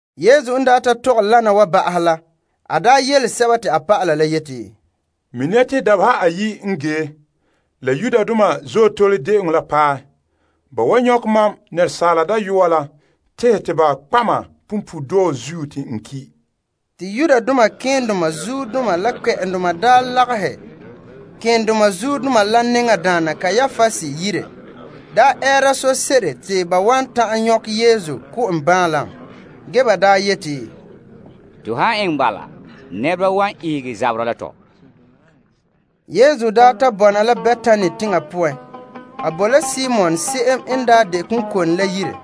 Yesu n daa tɔgɛ wana wa woo ba'ahɛ la, a daa yele a dɔlɔba la yeti, Mini ya te dabeha ayi' n ge la Azootole De'eŋɔ la paɛ. Ba wan nyɔkɛ Asaala Dayɔa la tehɛ ba kpa' ma punpuuredɔɔ zuo te n ki'. Malema keendoma la kpɛ'ɛndoma nya daa lagahɛ malema nɛŋadaana Kaiapas yire te ba ɛɛra sose'ere te ba wan ta'an nyɔkɛ Yesu ko' en baanlam. Ge ba yeti, To han eŋɛ dɛ Azootole saŋa wa, nɛreba la wan ihege zaberɛ la tɔ. Yesu n daa ta bɔna la Betani teŋa poan, a boe la Simon se'em n daa de konkone la yire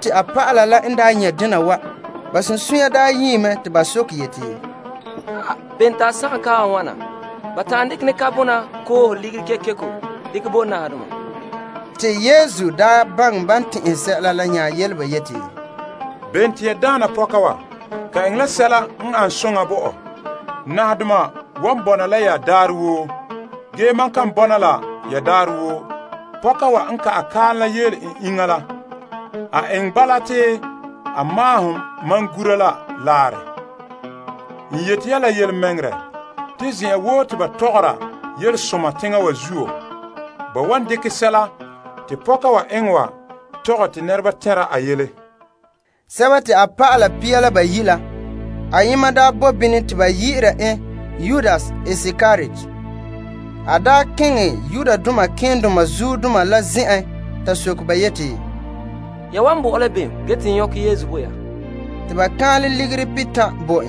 A dɔlɔba la n nyɛ' dena wa, ba sunsunya nyie mɛ te ba soke yeti, Bene te a sagom kaam wa wana? Ban ta'an dekɛ ne kaam wa koohe ligiri kekeko, ba ta'an dekɛ ligiri la bo nahadoma. Yesu baŋɛ ban tɛn'ɛhe sɛla la nya yele ba yeti, Bene te ya daana pɔka wa? Ka eŋɛ la sɛla n ane soŋa bo mam. Nahadoma wan bɔna la ya daarɛ woo, ge mam kan bɔna la ya daarɛ woo. Pɔka wa n ka'ɛ kaam la yeele en iŋa la, a eŋɛ bala te a maahom ma gura la laarɛ. N yeti ya la yelemɛŋɛrɛ, zen'an woo te ban mɔɔlɛ Yelesoma teŋa wa zuo, ba wan dekɛ sɛla te pɔka wa eŋɛ wa tɔgɛ te nɛreba tɛnra a yele. A dɔlɔba pia la bayi' ayema la se'em ba yi'ira Yudas Iskariot daa keŋɛ malema keendoma la zen'en. Ta soke ba yeti, Ya wan bo mam la bem ge te bahɛ te ya nyɔkɛ Yesu? Te ba kaanlɛ ligiri kɔnba pihitan' bo en.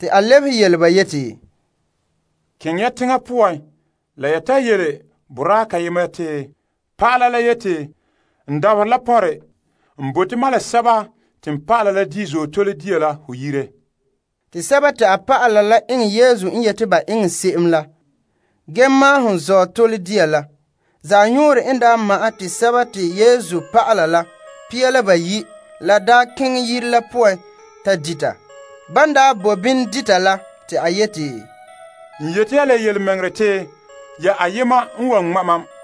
A lebehe yele ba yeti, Keŋɛ ya teŋa poan la ya ta yele boraa kayema te, Pa'ala la yeti, n dabaherɛ la pɔnre. N bote mam la n dɔlɔba la di' Azootole dia la ho yire. Te ba eŋɛ Yesu n yeti ba eŋɛ se'em la ge maahom Azootole dia la. Zanɔɔrɛ n daa ma'ɛn te Yesu la a dɔlɔba la pia la bayi' boe yire la poan ta dita. Ban daa boe bini dita la te a yeti, N yeti ya la yelemɛŋɛrɛ te ya ayema n wan ŋma' mam.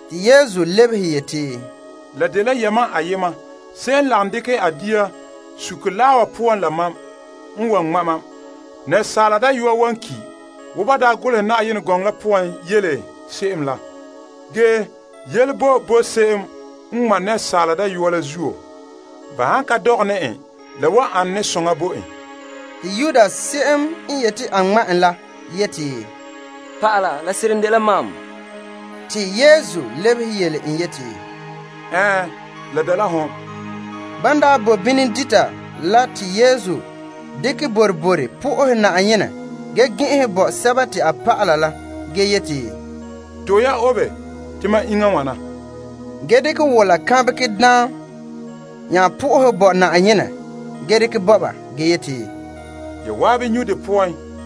Yesu lebehe yeti, La dela yamam ayema se'em n lagom dekɛ a dia suke laa wa poan la mam, n wan ŋma' mam. Asaala Dayɔa wan ki' wo ban golehe Yenɛ gɔŋɔ la poan yele se'em la. Ge yele boe bo se'em n ŋma' Asaala Dayɔa la zuo! Ba han ka dɔgɛ ne en, la wan ane soŋa bo en. Te Yudas se'em n yeti a ŋma' en la nya yeti, Naa, la wan dɛna mam? Te Yesu lebehe yeti, ho yele ya. Ban daa bo bini dita la te Yesu daa dekɛ boroboro bo Yenɛ fara ge gɛn'ɛnhɛ bo a dɔlɔba la ge yeti, To'e ya, obe, te mam iŋa n wana. Ge te a dekɛ daam la wola bo Yenɛ fara ge dekɛ bo ba ge yeti, Ya zan'an nyu' de poan.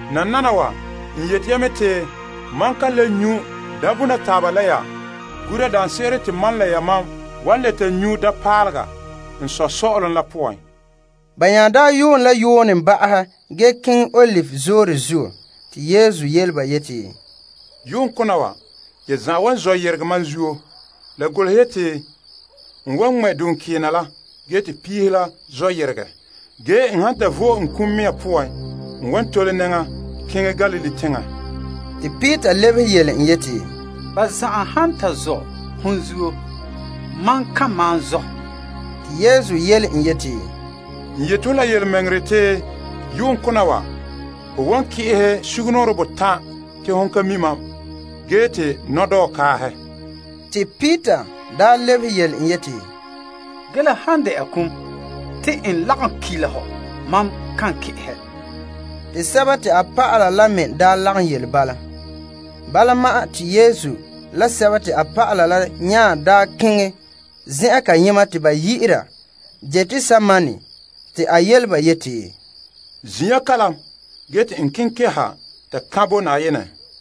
Nananawa n yele ya mɛ te mam kan le nyu' daambona taaba la ya, gura daanse'ere te mam la yamam wan le ta nyu' daampaalega n Sɔ' sɔ'ɔlom la poan. Ban nya daa yuun la yuunɛ ba'ahɛ, ba yehe keŋɛ Olive Zoore zuo. Yesu nya yele ba yeti, Yu'uŋ kona wa, ya zan'an wan zɔ' yeregɛ mam zuo. La golehe yeti, N wan ko' duŋkeena la, te piihe la zɔ yeregɛ. Ge n han to vo'e n kum mea poan n wan tole nɛŋa keŋɛ Galilee teŋa. Peter lebehe yeti, Ba zan'an han ta zɔ' ho zuo, mam kan malom zɔ'. Yesu yele en yeti, N yeti ho la yelemɛŋɛrɛ, te yu'uŋkona wa, ho wan ki'ehɛ sugumnɔɔren botan' te ho ka mi' mam ge te nɔdɔɔ kaahɛ. Peter lebehe yeti, Ge la han dɛna kum, te n lagom ki' la hɔ, mam kan ki'ehɛ. Te ba a dɔlɔba la me daa lagom yele bala. Yesu la a dɔlɔba la nya daa keŋɛ zen'an kayema te ba yi'ira Getsemane, te a yele ba yeti, Zin' ya kalam ge te n keŋɛ keha ta sohɛ Na'ayenɛ.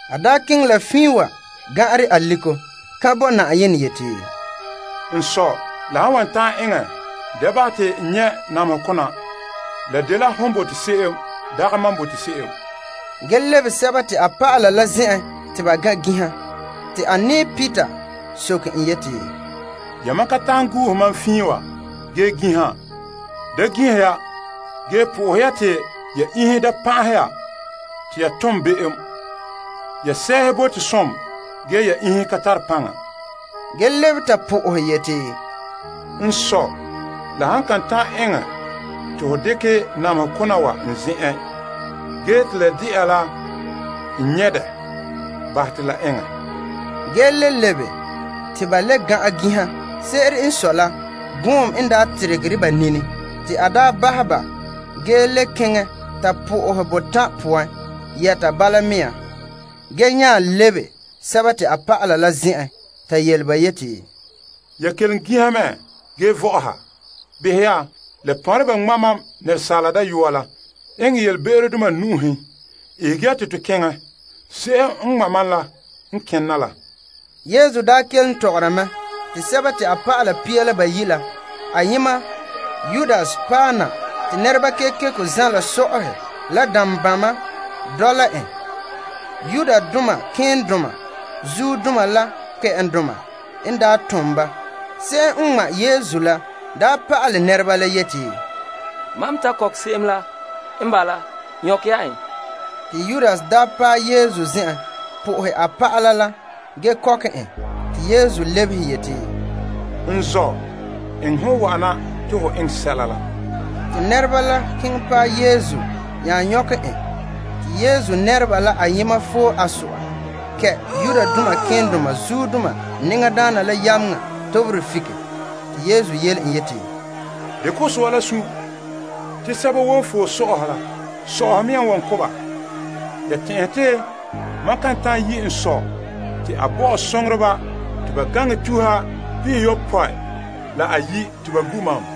A keŋɛ la fiin wa lu' aliko sohɛ Na'ayenɛ yeti, N Sɔ' la han wan ta'an eŋɛ, da bahɛ te n nyɛ' namehe kona. Ge la dela hon bote se'em, dagɛ mam bote se'em. A nya lebe a dɔlɔba la te ba gan' ginha. Te a nɛɛ Peter soke en yeti, Yamam kan ta'an gu'uhe mam fiin wa ge ginha? Da ginhi ya ge soha Yenɛ te ya da lu pa'ahegɔ poan. Ya sɛɛhe bote som ge ya iŋhe ka tare paŋa. A lebe ta sohɛ yeti, N Sɔ', la han kan ta'an eŋɛ te ho dekɛ namehe kona wa n zen'en, ge te la de'a la n nyɛ' dɛ, bahɛ te la eŋɛ. En le lebe te nyɛ ba le gan'an ginha. Se'ere n sɔe la, gɔɔm n teregere ba nini. Te a bahɛ ba ge le keŋɛ ta sohɛ Yenɛ botan' poan yɛta bala mea. A nya lebe a dɔlɔba ta yele ba yeti, Ya kelom ginha me ge vɔ'ɔha? Behɛ ya, la pɔnre ba ŋma' Asaala Dayɔa la eŋɛ yelebe'erodoma nu'uhen. Ihege ya te to keŋɛ. Se'em n ŋma' mam la n kena la. Yesu n daa kelom tɔgɔra mɛ, te Yudas se'em n de dɔlɔba pia la bayi' la ayema la paɛ na. Te nɛreba kekeko zala so'ahe la dambama dɔla en. Malema keendoma la kpɛ'ɛndoma n daa tom ba. Se'em n ŋmaa Yesu la daa pa'ale nɛreba la yeti, Mam ta kɔkɛ se'em la, n bala. Nyɔkɛ ya en. Yudas paɛ Yesu, po'ohɛ a pa'ala la, ge kɔkɛ en. Yesu lebehe yeti, N zɔ', eŋɛ hon wa'ana te ho eŋɛ sɛla la. Te nɛreba la keŋɛ paɛ Yesu nya nyɔkɛ en. Yesu nɛreba ayema foe a so'a kɛ' malema nɛŋadaana la yameŋa toberɛ fike. Yesu yele en yeti, Dekɛ ho so'a la sun'. Te sɛba woo n foe so'ahe la, so'ahe mea n wan ko' ba. Ya tɛn'ɛhe te mam kan ta'an yi' n Sɔ' te a bo mam a soŋoreba te ba gaŋɛ tuha pihiyopɔe la ayi' te ba gu' mam?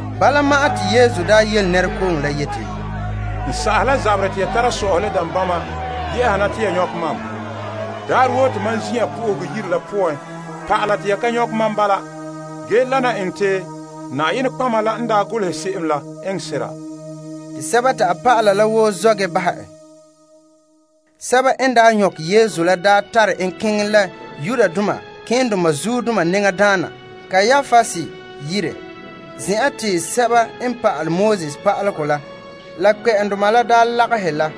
Bala ma'an te Yesu yele nɛrekooŋɔ la yeti, N sa'ahe la zaberɛ te ya tara so'ahe la dambama yehe na te ya nyɔkɛ mam? Daarɛ woo te mam zin'an Yenɛ Yire la poan pa'ala te ya ka nyɔkɛ mam bilam. Ge wana enŋɛ te nɔtɔgɔheba la n daa golehe se'em la eŋɛ sera. Te a dɔlɔba la woo zɔ' ge bahɛ en. Sɛba n daa nyɔkɛ Yesu la tare en keŋɛ la malema nɛŋadaana Kaiapas yire, zen'an te sɛba n pa'alegɔ pa'alaba la keendoma la daa lagahe la.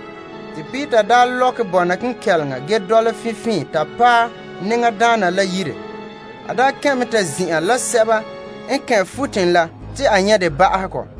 Ge Peter lɔkɛ bɔna kenkɛleŋa ge dɔla finfiinhe to paɛ malema nɛŋadaana la yire. A kɛn' mɛ ta zin'an la nɛŋadaana la guruba la, te a nyɛ' de ba'ahegɔ.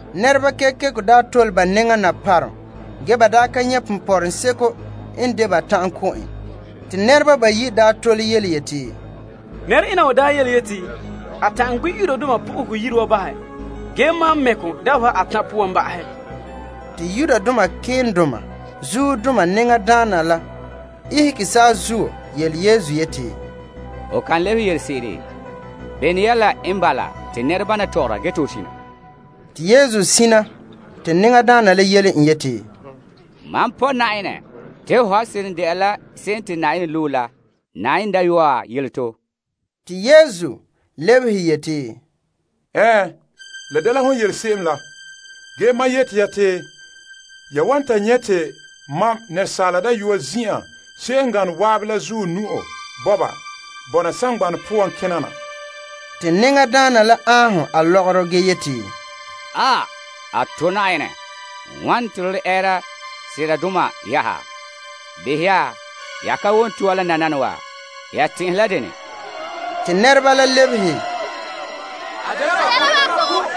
Paromdoma kekeko tole ba nɛŋa na ge ba daa ka nyɛ' ponpɔrɔŋɔ seko n dekɛ te ba wan ta'an ko' en. Pooren nɛreba bayi' tole yeti, Nɛre'ena wa daa yeti, a ta'an gbi' Yenɛ Yire wa bahɛ ge maan mɛ' kɔ dabeha atan' poan ba'ahɛ. Te malema nɛŋadaana la ihege saazuo yele Yesu yeti, Ho kan lebehe yelese'ere? Bene yɛla n bala te nɛrebana tɔgɔra ge te ho sina? Te Yesu sina. Te nɛŋadaana la yele en yeti, Mam pɔ' Yenɛ te ho han seren de'a la Krista, Yenɛ Dayɔa, yele to. Yesu lebehe yeti, Ɛɛn, la dela hon yele se'em la. Ge mam yeti ya te ya wan ta nyɛ' te Asaala Dayɔa zin'an se'em n gane zan'an la zuɔ bɔna saŋgbana poan kena na. Te malema nɛŋadaana la aanhom a lɔgɔrɔ ge yeti, A to' Na'ayenɛ. Wane te to le ɛɛra seradoma yɛ'ɛha? Behɛ ya, ya ka wom to'ore la nananawa? Ya tɛn'ɛhe la dene? Te ba lebehe, A dela ba ko'.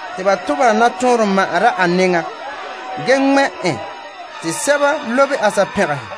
Te ba tobehɛ nɔtɔɔnrom ma' a nɛŋa ge ŋmɛ' en te sɛba lobe a pɛgɛhe,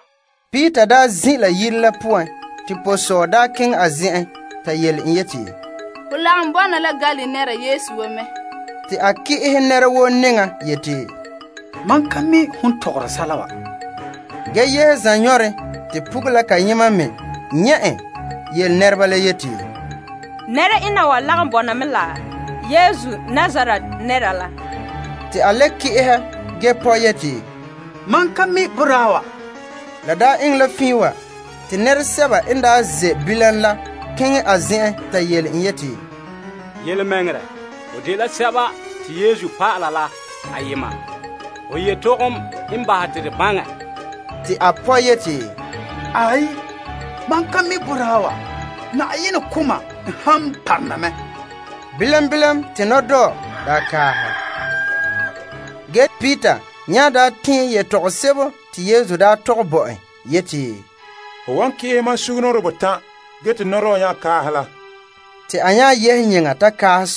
Peter n daa zin' la yire la zenzaka, te pɔsɔɔ keŋɛ a zen'en ta yele en yeti, Ho lagom bɔna la Galilee nɛra Yesu wa mɛ. Te a ki'ehɛ nɛra woo nɛŋa yeti, Mam ka mi' hon tɔgɔre sɛla wa. A nya yehe zanɔɔren te pugula kayema me nyɛ' en yele nɛreba la yeti, Nɛre'ena wa lagom bɔna mɛ la Yesu Nazaret nɛra la. Te a le ki'ehɛ ge pɔ' yeti, Mam ka mi' boraa wa. La eŋɛ la fiin wa, te nɛresɛba n ze' bilam la keŋɛ a zen'en ta yele en yeti, Yelemɛŋɛrɛ, ho dela bama la ayema. Ho yetɔgom n bahɛ te to baŋɛ. Te a pɔ' yeti, Mam ka mi' boraa wa. Na'ayenɛ ko' mam n han parona mɛ. Bilam bilam te nɔdɔɔ daa kaahɛ. Te Peter nya daa tɛɛn yetɔgom sebo te Yesu daa tɔgɛ bo en yeti, Ho wan ki'ehɛ mam sugumnɔɔren botan' ge te nɔdɔɔ nya kaahɛ la, te a nya yehe yeŋa ta kaahɛ.